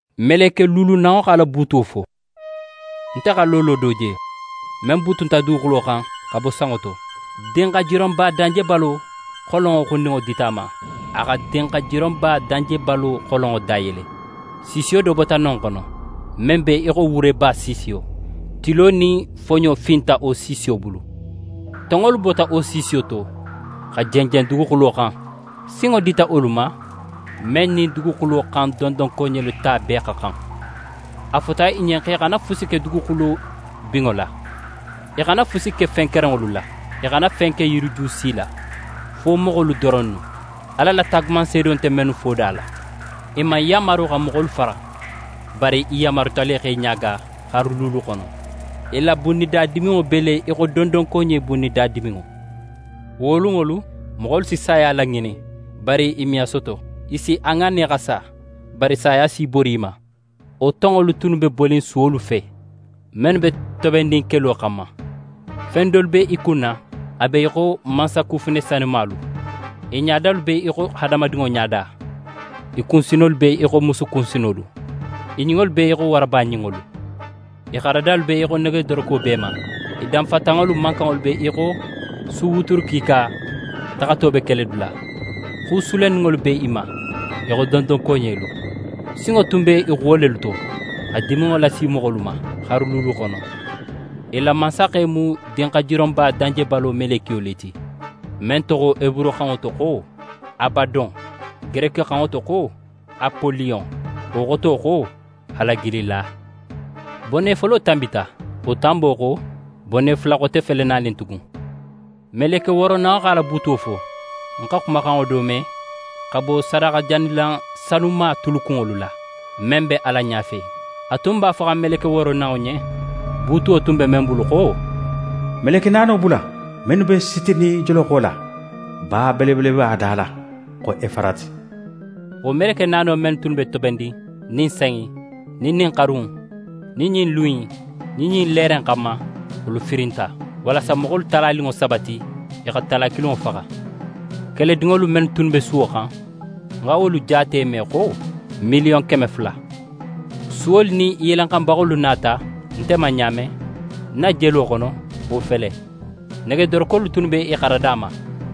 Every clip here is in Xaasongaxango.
Meleke luulunanŋo x'a la buutuwo fo. Nte xa loolo do je, men butunta duguxulo xan xa bo sanŋo to. Dinxajironba danjebalo xolonŋo xundinŋo dita a ma. A xa dinxajironba danjebalo xolonŋo dayele. Siisiyo do bota non xono, men be í xo wureba siisiyo. Tilo nin foɲo finta wo siisiyo bulu. Tonŋolu bota wo siisiyo to xa jenjen duguxulo xan. Sinŋo dita wolu ma, men nin duguxulo xan dondonkoɲelu ta bee xa xan. A fota i ɲen x'e xana fusi ke duguxulo binŋo la, i xana fusi ke fen kerenŋolu la, i xana fen ke yiriju si la, fo moxolu doronnu, Ala la taagumanseedo nte mennu foda la. I man yanmaru xa moxolu faxa, bari i yanmaruta le x'e ɲaaga xaru luulu xono. I la bunnida diminŋo be le í xo dondonkoɲe bunnida diminŋo. Wo lunŋolu, moxolu si saya laŋinin, bari i me a soto. I si a ŋanne xa sa, bari saya si í bori i ma. Wo tonŋolu tunnu be bonin suwolu fe, mennu be tobennin kelo xanma. Fen dolu be i kunna a be í xo mansakufune sanumalu. I ɲadalu be í xo hadamadinŋo ɲada. I kunsinolu be í xo musu kunsinolu, i ɲinŋolu be í xo waraba ɲinŋolu. I xaradalu be í xo negedoroko b'e ma, i danfatanŋolu mankanŋo be í xo su wuturu kiika taxato be keledula. Xu sulenninŋolu b'e ma í xo dondonkoɲelu. Sinŋo tun be i xuwo lelu to xa diminŋo lasi moxolu ma xaru luulu xono. I la mansaxe mu dinxajironba danjebalo melekiyo le ti, men toxo heburuxanŋo to xo «Abadon», gerekixanŋo to xo «Apoliyon». Wo xoto xo «Halagilila». Bone folo tanbita, wo tanbo xo, bone fula xote fele nanin tugun. Meleke wooronanŋo x'a la buutuwo fo. Ń xa xumaxanŋo do me, xa bo sadaxajanilan sanuma tulukunŋolu la, men be Ala ɲafe. A tun b'a foxan meleke wooronanŋo ɲen, buutuwo tun be men bulu xo: «Meleke naano bula, mennu be sitinin joloxo la, ba belebeleba da la, xo Efarati.» Wo meleke naano men tunnu be tobennin ɲin san in, nin ɲin xaru in, nin ɲin lun in, nin ɲin leere in xanma, wolu firinta, walasa moxolu talaninŋo saba ti, i xa tala kilinŋo faxa. Keledinŋolu men tunnu be suwo xan, ń xa wolu jaate me xo: Miliyon keme fula. Suwolu nin i yelenxanbaxolu nata nte ma ɲa men, ń na jelo xono, wo fele: Negedorokolu tunnu be i xarada ma,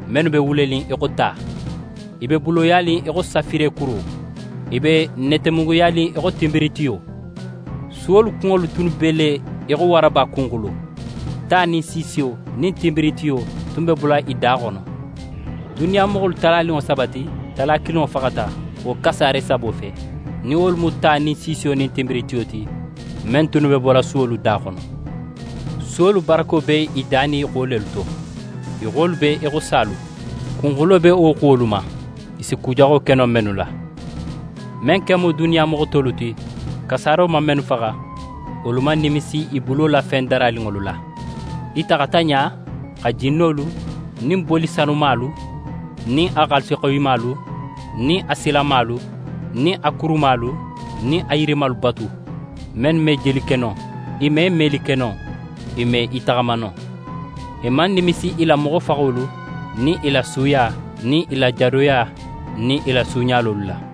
mennu be wulenin í xo ta, i be buloyanin í xo safirekuro, i be netemunguyanin í xo tinbiritiyo. Suwolu kunŋolu tunnu be le í xo waraba kunxulo, ta nin siisiyo nin tinbiritiyo tun be bola i da xono. Duniya moxolu talaninŋo saba ti, tala kilinŋo faxata wo kasaare sabo fe, nin wolu mu ta nin siisiyo nin tinbiritiyo ti, men tunnu be bola suwolu da xono. Suwolu barako be i da nin i xuwo lelu to. I xuwolu be í xo salu. Kunxulo be wo xuwolu ma, i si ku jaxo ke no mennu la. Men ken mu duniya moxo tolu ti, kasaaro man mennu faxa, wolu man nimisi i bulo la fen daraninŋolu la. I taxata ɲa xa jinnolu nin boli sanumalu, nin a xaalisixoyimalu, nin a silamalu, nin a kurumalu, nin a yirimalu batu, mennu me jeli ke no, i me meli ke no, i me i taxama no. I man nimisi i la moxofaxolu nin i la suuya nin i la jadoya nin i la suuɲalolu la.